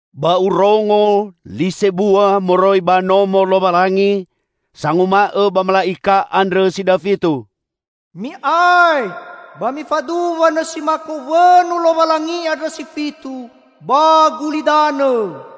Ba urongo li sebua moroi ba Nomo Lowalangi sanguma'õ ba mala'ika andrõ si dafitu, "Mi'ae ba mifaduwa nõsi mako wõnu Lowalangi andrõ si fitu ba gulidanõ!"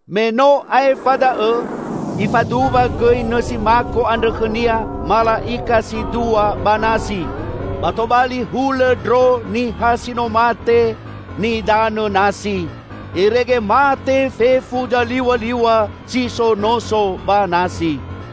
Me no aefa da'õ ifaduwa gõi nõsi mako andrõ khõnia mala'ika si dua ba nasi. Ba tobali hulõ ndro niha si no mate nidanõ nasi, irege mate fefu zaliw̃aliw̃a si so noso ba nasi.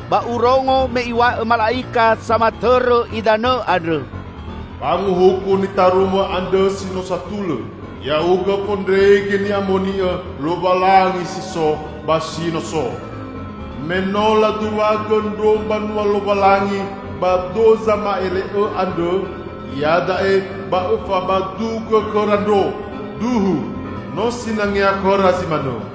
Ba urongo me iw̃a'õ mala'ika samatõrõ idanõ andrõ, "Fanguhuku nitarumõ andrõ no satulõ, Ya'ugõ Fondrege Ni'amoni'õ, Lowalangi si so, ba si no so! Me no laduwagõ ndro mbanua Lowalangi ba do zama'ele'õ andrõ; iada'e ba Õfabadugõ khõra ndro. Duhu no sinangea khõra zi manõ!"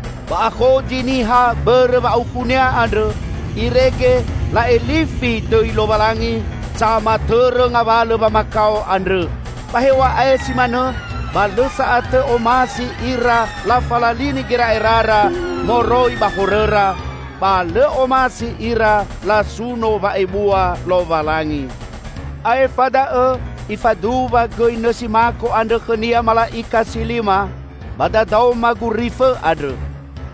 Ba akhozi niha bõrõ wa'aukhunia andrõ, irege la'elifi dõi Lowalangi, samatõrõ ngawalõ wamakao andrõ. Ba hew̃a'ae si manõ, ba lõ sa'atõ omasi ira lafalalini gera'erara moroi ba horõra, ba lõ omasi ira lasuno wa'ebua Lowalangi. Aefa da'õ ifaduwa gõi nõsi mako andrõ khõnia mala'ika si lima, ba dadaoma gurifõ andrõ.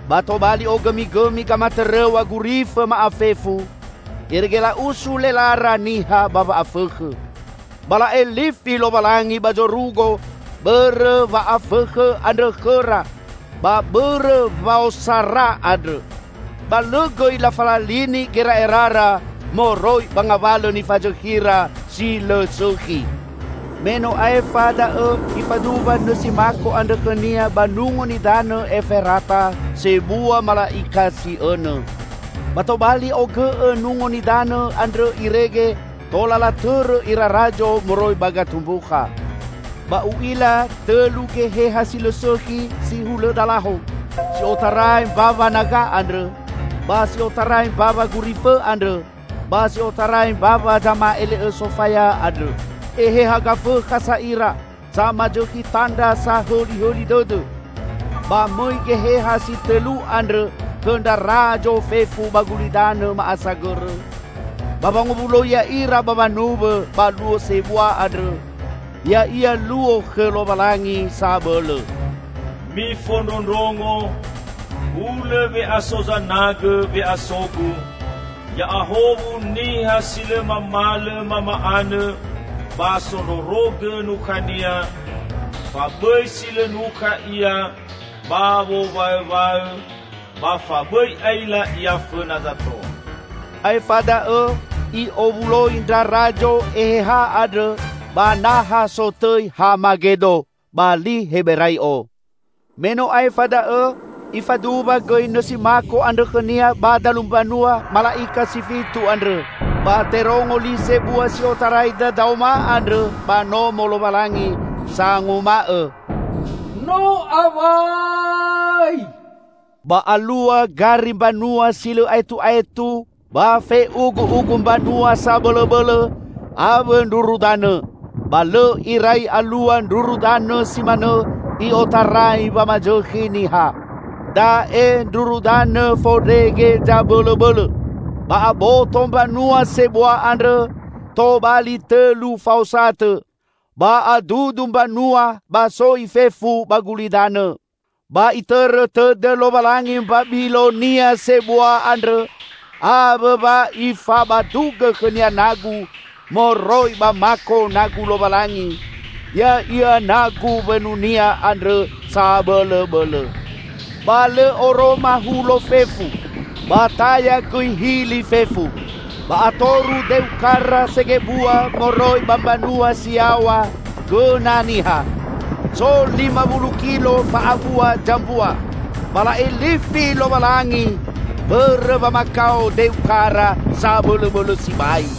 Ba tobali ogõmigõmi gamatõrõw̃a gurifõ ma'afefu, irege la'usu lelara niha ba wa'afõkhõ. Ba la'elifi Lowalangi ba zorugo bõrõ wa'afõkhõ andrõ khõra ba bõrõ waosara andrõ. Ba lõ gõi lafalalini gera'erara moroi ba ngawalõ nifazõkhira si lõ sõkhi. Me no aefa da'õ ifaduwa nõsi mako andrõ khõnia ba Nungo Nidanõ Eferata sebua mala'ika si õnõ. Ba tobali ogõ'õ nungo nidanõ andrõ irege tola latõrõ ira razo moroi ba gatumbukha. Ba u'ila tõlu geheha si lõ sõkhi si hulõ dalaho, si otarai mbawa naga andrõ, ba si otarai mbawa gurifõ andrõ, ba si otarai mbawa zama'ele'õ sofaya andrõ. Eheha gafõkha sa ira, samazõkhi tandra sahõlihõli dõdõ. Ba mõi geheha si tõlu andrõ khõ ndra razo fefu ba gulidanõ ma'asagõrõ, ba wangowuloi ya'ira ba wanuwõ ba Luo sebua andrõ, ya'ia Luo khõ Lowalangi Sabõlõ. "Mifondrondrongo! Hulõ we'aso zanagõ we'aso-Gu! Ya'ahowu niha si lõ mamalõ mama'anõ ba sondrorogõ nukhania, fa bõi si lõ nukha ia ba wowaõwaõ ba fa bõi aila ia fõna zato!" Aefa da'õ i'owuloi ndra razo eheha andrõ ba naha sotõi Hamagedo, ba li Heberai'o. Me no aefa da'õ ifaduwa gõi nõsi mako andrõ khõnia ba dalu mbanua mala'ika si fitu andrõ. Ba terongo li sebua si otarai dadaoma andrõ ba Nomo Lowalangi, sanguma'õ, "No awai!" Ba alua gari mbanua si lõ aetu'aetu ba fe'ugu'ugu mbanua sabõlõbõlõ, awõ ndruru danõ. Ba lõ irai alua ndruru danõ si manõ i'otarai wamazõkhi niha. Da'e ndruru danõ fondrege zabõlõbõlõ! Ba aboto mbanua sebua andrõ tobali tõlu faosatõ, ba adudu mbanua ba soi fefu ba gulidanõ. Ba Itõrõ tõdõ Lowalangi Mbabilonia sebua andrõ. Awõ wa Ifabadugõ khõnia nagu moroi ba mako nagu Lowalangi -- ya'ia nagu wõnu-Nia andrõ sabõlõbõlõ. Ba lõ oroma hulo fefu, ba taya gõi hili fefu. Ba atoru deu kara segebua moroi ba mbanua si yaw̃a gõna niha, so lima wulu kilo fa'abua zambua. Ba la'elifi Lowalangi bõrõ wamakao deu kara sabõlõbõlõ sibai.